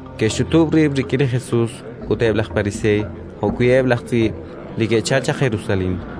Ke'xch'utub' rib' rik'in li Jesus eb' laj Pariseey jo'wi' eb' laj tz'iib' li ke'chalk chaq Jerusalén.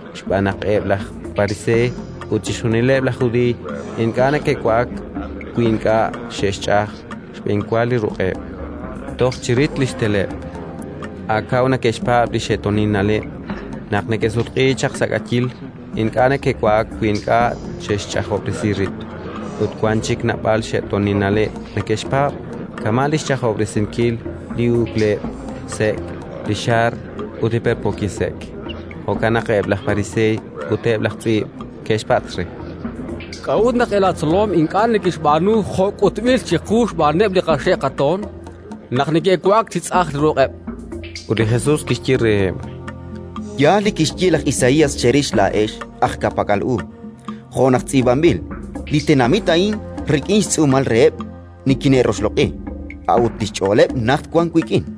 (xb'aan naq eb' laj Pariseey ut chixjunileb' laj Judiiy ink'a' neke'wa'ak, wi ink'a' xe'xch'aj xb'enwa li ruq'eb' toj chi rit xteleb', a' kaw neke'xpaab' li xe'toonil na'leb'; naq neke'sutq'iik chaq sa' k'ayiil, ink'a' neke'wa'ak, wi ink'a' xe'xch'ajob'resi rib'. Ut wank chik naab'al xe'toonil na'leb' neke'xpaab', kama' li xch'ajob'resinkil li uk'leb' sek', li xaar ut li perpookil sek'), jo'kan naq eb' laj Pariseey ut eb' laj tz'iib' ke'xpatz' re: —K'a'ut naq eb' laatzolom ink'a' neke'xb'aanu jo' k'utb'il chiqu xb'aaneb' li qaxe' qatoon, naq neke'wa'ak chi tz'aj ruq'eb'? chankeb'. Ut li Jesus kixye reheb': —Yaal li kixye laj Isaías cherix laa'ex, aj ka'pak'al u, jo' naq tz'iib'anb'il: «Li tenamit a'in rik'in xtz'uumal reheb' nikine'roxloq'i, a'ut li xch'ooleb' najt wank wik'in.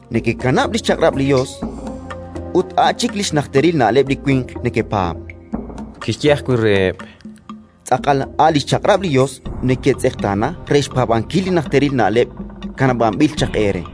Nekekanab' li xchaq'rab' li Yos ut a' chik li xnajteril na'leb' li winq nekepaab'. Kixye ajwi' reheb': —Tz'aqal a' li xchaq'rab' li Yos neketz'eqtaana re xpaab'ankil li najteril na'leb' kanab'anb'il chaq eere.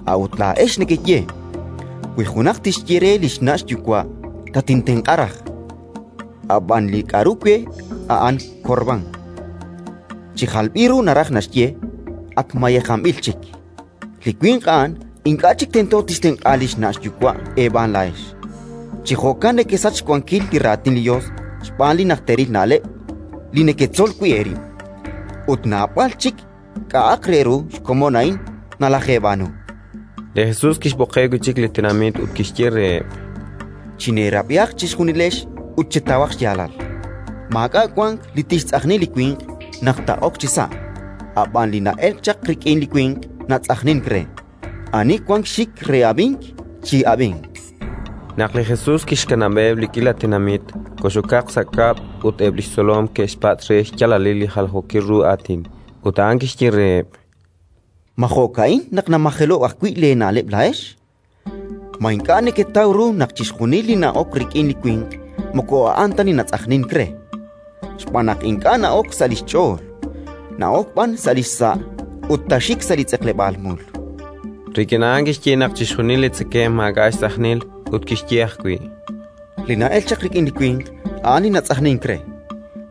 A'ut laa'ex nekeye: «Wi junaq tixye re li xna' xyuwa': Tatintenq'a raj, ab'an li k'aru we a'an korbán -chi jalb'il ru naraj naxye: ak mayejanb'il chik-, li winq a'an ink'a' chik tento tixtenq'a li xna' xyuwa' eeb'aan laa'ex». Chi jo'kan nekesach xwankil li Raatin li Yos xb'aan li najteril na'leb' li neketzol wi' eerib'. Ut naab'al chik k'a'aq re ru xkomon a'in nalajeeb'aanu. Li Jesus kixb'oqeb' wi' chik li tenamit ut kixye reheb': —Chineerab'ihaq chejunilex ut chetawaq xyaalal. Maak'a' wank li tixtz'ajni li winq naq taa'ok chisa'; a' b'an li na'elk chaq rik'in li winq natz'ajnink re. Ani wank xxik re ab'ink, chi'ab'inq. Naq li Jesus kixkanab'eb' li k'iila tenamit, kox'okaq sa' kab'l ut eb' li xtzolom ke'xpatz' re xyaalalil li jaljookil ru aatin. Ut a'an kixye reheb': —Ma jo'ka'in naq namajelo'k ajwi' leena'leb' laa'ex? Ma ink'a' neketaw ru naq chixjunil li na'ok rik'in li winq moko a'an ta li natz'ajnink re, xb'aan naq ink'a' na'ok sa' li xch'ool, na'ok b'an sa' li xsa' ut taaxik sa' li tz'eqleb'aal mul? Rik'in a'an kixye naq chixjunil li tzekemq maak'a' xtz'ajnil. Ut kixye ajwi': —Li na'elk chaq rik'in li winq, a'an li natz'ajnink re,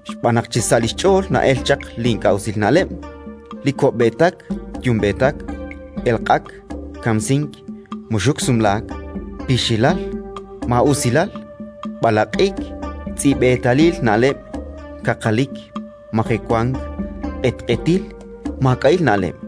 xb'aan naq chisa' li xch'ool na'elk chaq li ink'a' usil na'leb': li ko'b'eetak yumb'eetak, elq'ak, kamsink, muxuk sumlaak, pixilal, maa'usilal, b'alaq'ik, tz'i'b'eetalil na'leb', kaqalik, majewank, q'etq'etil, maak'a'il na'leb'.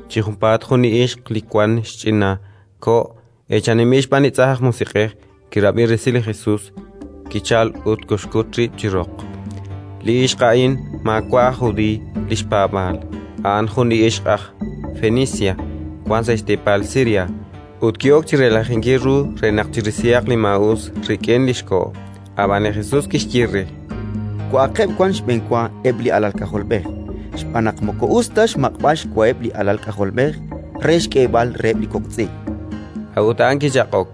Chi junpaat jun li ixq li wank xch'ina ko' eechaninb'il xb'aan tz'ajn aj musiq'ej, kirab'i resil li Jesus, kichalk ut kolxkut rib' chi roq. Li ixq a'in maawa' aj Judiiy li xpaab'aal, a'an jun li ixq aj Fenicia wank sa' xteepal Siria; ut ki'ok chi relajinkil ru re naq chirisihaq li maa'us rik'in li xko'. Ab'an li Jesus kixye re: —Wa'aqeb' wan xb'enwa eb' li alal k'ajolb'ej, xb'aan naq moko us ta xmaq'b'al xwaheb' li alal k'ajolb'ej re xk'eeb'al reheb' li kok' tz'i'. A'ut a'an kichaq'ok: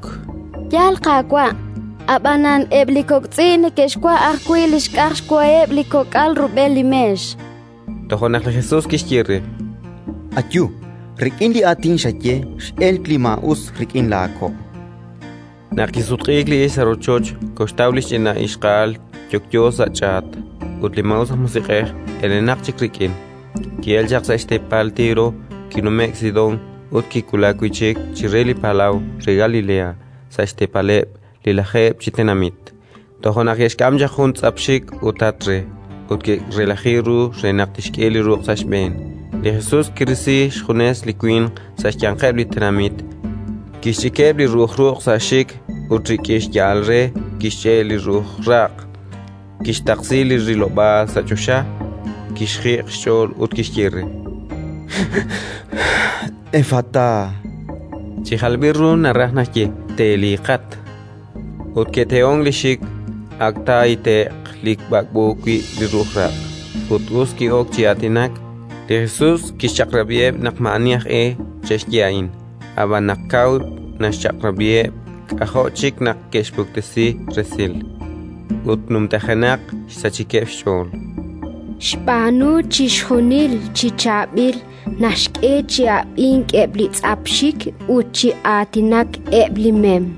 —Yaal, Qaawa', ab'anan eb' li kok' tz'i' neke'xwa' ajwi' li xk'aj xwaheb' li kok'al rub'el li meex, chan. Toja' naq li Jesus kixye re: —Ayu. Rik'in li aatin xaye x'elk li maa'us rik'in laako'. Naq kisutq'iik li ixq sa' rochoch, koxtaw li ch'ina ixqa'al yokyo sa' ch'aat, ut li maa'us aj musiq'ej elenaq chik rik'in. Ki'elk chaq sa' xteepal Tiro, kinume'k Sidón ut kiwulak wi' chik chire li palaw re Galilea, sa' xteepaleb' li Lajeeb' chi Tenamit. Toja' naq ke'xk'am chaq jun tz'ap xik ut tat re, ut ke'relaji ru re naq tixk'e li ruq' sa' xb'een. Li Jesus kirisi xjunes li winq sa' xyanqeb' li tenamit, kixch'ikeb' li ru'uj ruq' sa' xxik ut rik'in xya'al re kixch'e' li ru'uj raq'. Kixtaqsi li rilob'aal sa' choxa, kixjiq' xch'ool ut kixye re: “Effatá”, chi jalb'il ru naraj naxye: “Teliiqat!”. Ut ke'tehonk li xxik, ak taahite'q li b'ak'b'o wi' li ru'uj raq', ut us ki'ok chi aatinak. Li Jesus kixchaq'rab'iheb' naq maa'ani aj e che'xye a'in; ab'an, naq kaw naxchaq'rab'iheb', k'ajo' chik naq neke'xpuktesi resil. Ut numtajenaq xsachikeb' xch'ool: “Xb'aanu chixjunil chi chaab'il -chankeb'-. Naxk'e chi ab'ink eb' li tz'ap xxik ut chi aatinak eb' li mem”.